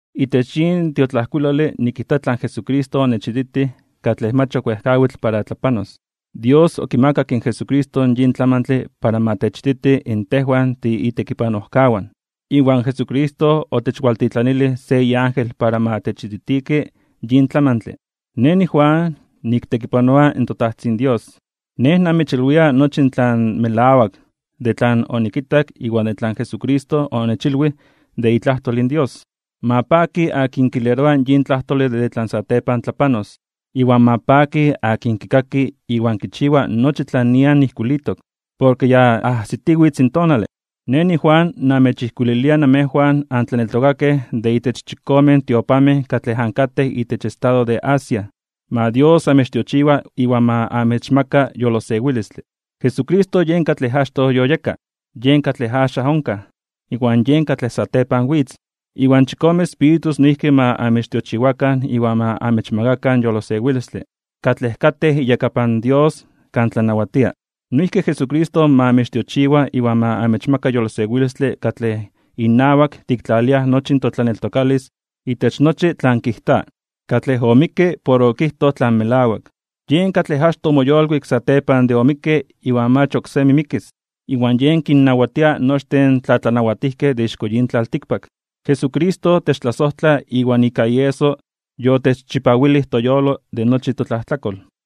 Itech yin tiotlajkuilole nikijta tlan Jesucristo onechititij katlej mach ok wejkawitl para tlapanos. Dios okimakak in Jesucristo yin tlamantle para ma techititi in tejwan tiitekipanojkawan. Iwan Jesucristo onechwaltitlanilij se iángel para ma nechititiki yin tlamantle. Nej niJuan niktekipanoa in toTajtzin Dios. Nej namechilwia nochi tlan melawak de tlan onikitak iwan tlan Jesucristo onechilwij de itlajtol in Dios. Ma paki akin kileroa yin tlajtole de tlan satepan tlapanos, iwan ma paki akin kikaki iwan kichiwa nochi tlan nian ijkuilitok. Porke ya ajsitiwitz in tonale. Nej niJuan, namechtlajkuililia namejwan antlaneltokakej de itech chikomen tiopanmej katlej ankatej itech estado de Asia. Ma Dios amechtiochiwa iwan ma amechmaka yolosewilistle. Jesucristo yen katlej achtoj yoyeka, yen katlej axan onkaj, iwan yen katlej satepan witz. Iwan chikome espíritus noijki ma amechtiochiwakan iwan ma amechmakakan yolosewilistle, katlej katej iyakapan Dios kan tlanawatia. Noijki Jesucristo ma amechtiochiwa iwan ma amechmaka yolosewilistle katlej inawak tiktlaliaj nochi totlaneltokalis itech nochi tlan kijta, katlej omikke porke okijtoj tlan melawak. Yen katlej achtoj omoyolkuik satepan de omikke iwan mach oksemi mikis, iwan yen kinnawatia nochtin in tlatlanawatijkej de ixko yin tlaltikpak. Jesucristo techtlasojtla iwan ika ieso yotechchipawilij toyolo de nochi totlajtlakol.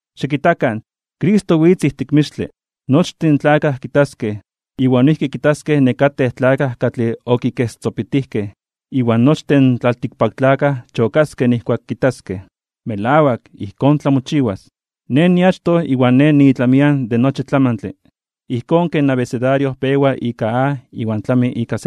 Xikitakan, Cristo witz ijtik mixtle. Nochtin in tlakaj kitaskej, iwan noijki kitaskej nekatej tlakaj katlej okikestzopitijkej. Iwan nochtin in tlaltikpaktlakaj chokaskej nijkuak kitaskej. Melawak, ijkón tlamochiwas. “Nej niachtoj iwan Nej niitlamian de nochi tlamantle, ijkón ken abecedario pewa ika A iwan tlami ika Z”,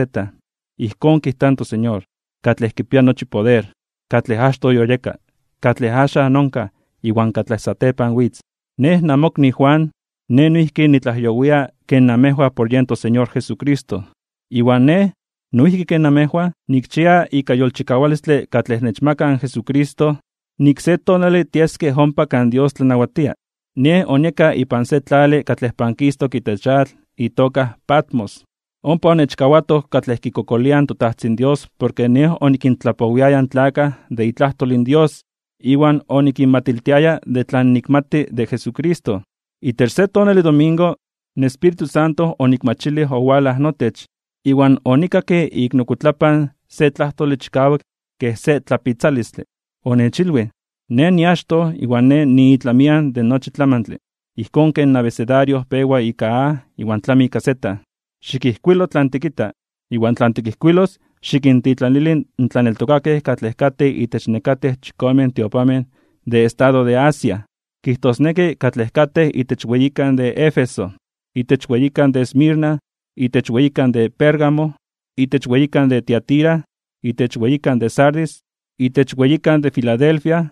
ijkón kijta in toSeñor, katlej kipia nochi poder, katlej achtoj yoyeka, katlej axan onkaj, iwan katlej satepan witz. Nej namokni Juan, nej noijki nitlajyowia ken namejwan por yen toSeñor Jesucristo. Iwan nej, noijki ken namejwan, nikchia ika yolchikawalistle katlej nechmaka in Jesucristo, nik se tonale tieskej ompa kan Dios tlanawatia. Nej onieka ipan se tlale katlej pankistok itech atl itoka Patmos. Ompa onechkawatoj katlej kikokoliaj in toTajtzin Dios porke nej onikintlapowiaya in tlakaj de itlajtol in Dios iwan onikinmatiltiaya de tlan nikmati de Jesucristo. Itech se tonale domingo, in Espíritu Santo onikmachilij owalaj notech, iwan onikakke ik nokuitlapan se tlajtole chikawak kej se tlapitzalistle. Onechilwij: ―Nej niachtoj iwan Nej niitlamian de nochi tlamantle, ijkón ken abecedario pewa ika A iwan tlami ika Z. Xikijkuilo tlan tikita, iwan tlan tikijkuilos xikintitlanili in tlaneltokakej katlej katej itech nekatej chikomen tiopanmej de estado de Asia, kijtosneki katlej katej itech weyikan de Éfeso, itech weyikan de Esmirna, itech weyikan de Pérgamo, itech weyikan de Tiatira, itech weyikan de Sardis, itech weyikan de Filadelfia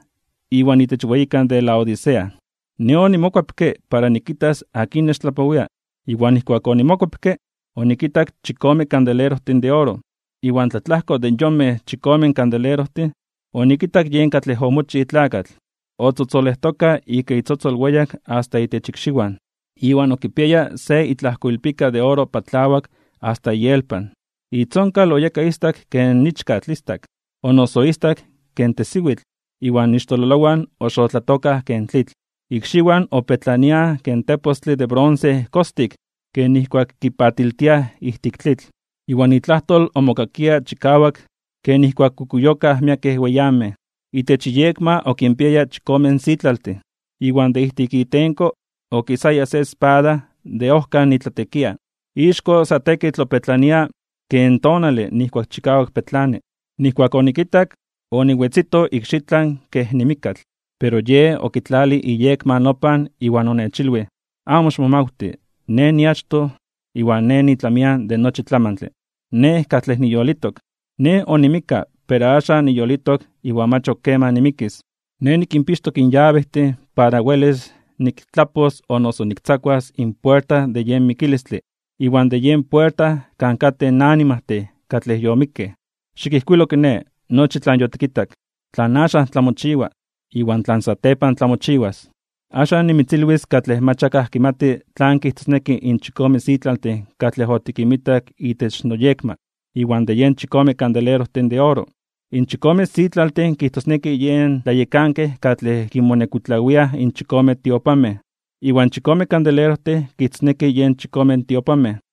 iwan itech weyikan de Laodicea. Nej onimokuepke para nikitas akin nechtlapowia, iwan nijkuak onimokuepke, onikitak chikome kandelerojtin de oro, iwan tlatlajko de yen yonmej chikome kandelerojtin, onikitak yen katlej omochij tlakatl, otzotzolejtoka ika itzotzol weyak asta itech ikxiwan, iwan okipiaya se itlajkoilpika de oro patlawak asta ielpan. Itzonkal oyeka istak ken ichkatl istak, o noso istak ken tesiwitl, iwan ixtololowan oxotlatokaj ken tlitl. Ikxiwan opetlaniaj ken tepostle de bronce kostik ken nijkuak kipatiltiaj ijtik tlitl. Iwan itlajtol omokakia chikawak ken nijkuak kukuyokaj miekej weyamej. Itech iyekma okinpiaya chikome sitlaltin, iwan de ijtik itenko okisaya se espada de ojkan itlatekia. Ixko sa tekitl opetlania ken tonale nijkuak chikawak petlani. Nijkuak onikitak, oniwetzito ikxitlan kej nimikkatl. Pero Yej okitlalij iyekma nopan iwan onechilwij: ―Amo ximomawti. Nej niachtoj iwan Nej niitlamian de nochi tlamantle, Nej katlej niyolitok. Nej onimikka, pero axan niyolitok iwan mach ok keman nimikis. Nej nikinpixtok in yabejtin para welis niktlapos o noso niktzakuas in puerta de yen mikilistle iwan de yen puerta kan katej in animajtin katlej yomikkej. Xikijkuilo kiné, nochi tlan yotikitak, tlan axan tlamochiwa, iwan tlan satepan tlamochiwas. Axan nimitzilwis katlej mach akaj kimati tlan kijtosneki in chikome sitlaltin katlej otikinmitak itech noyekma, iwan de yen chikome kandelerojtin de oro. In chikome sitlaltin kijtosneki yen tlayekankej katlej kinmonekuitlawiaj in chikome tiopanmej. Iwan in chikome kandelerojtin kijtosneki yen chikome tiopanmej.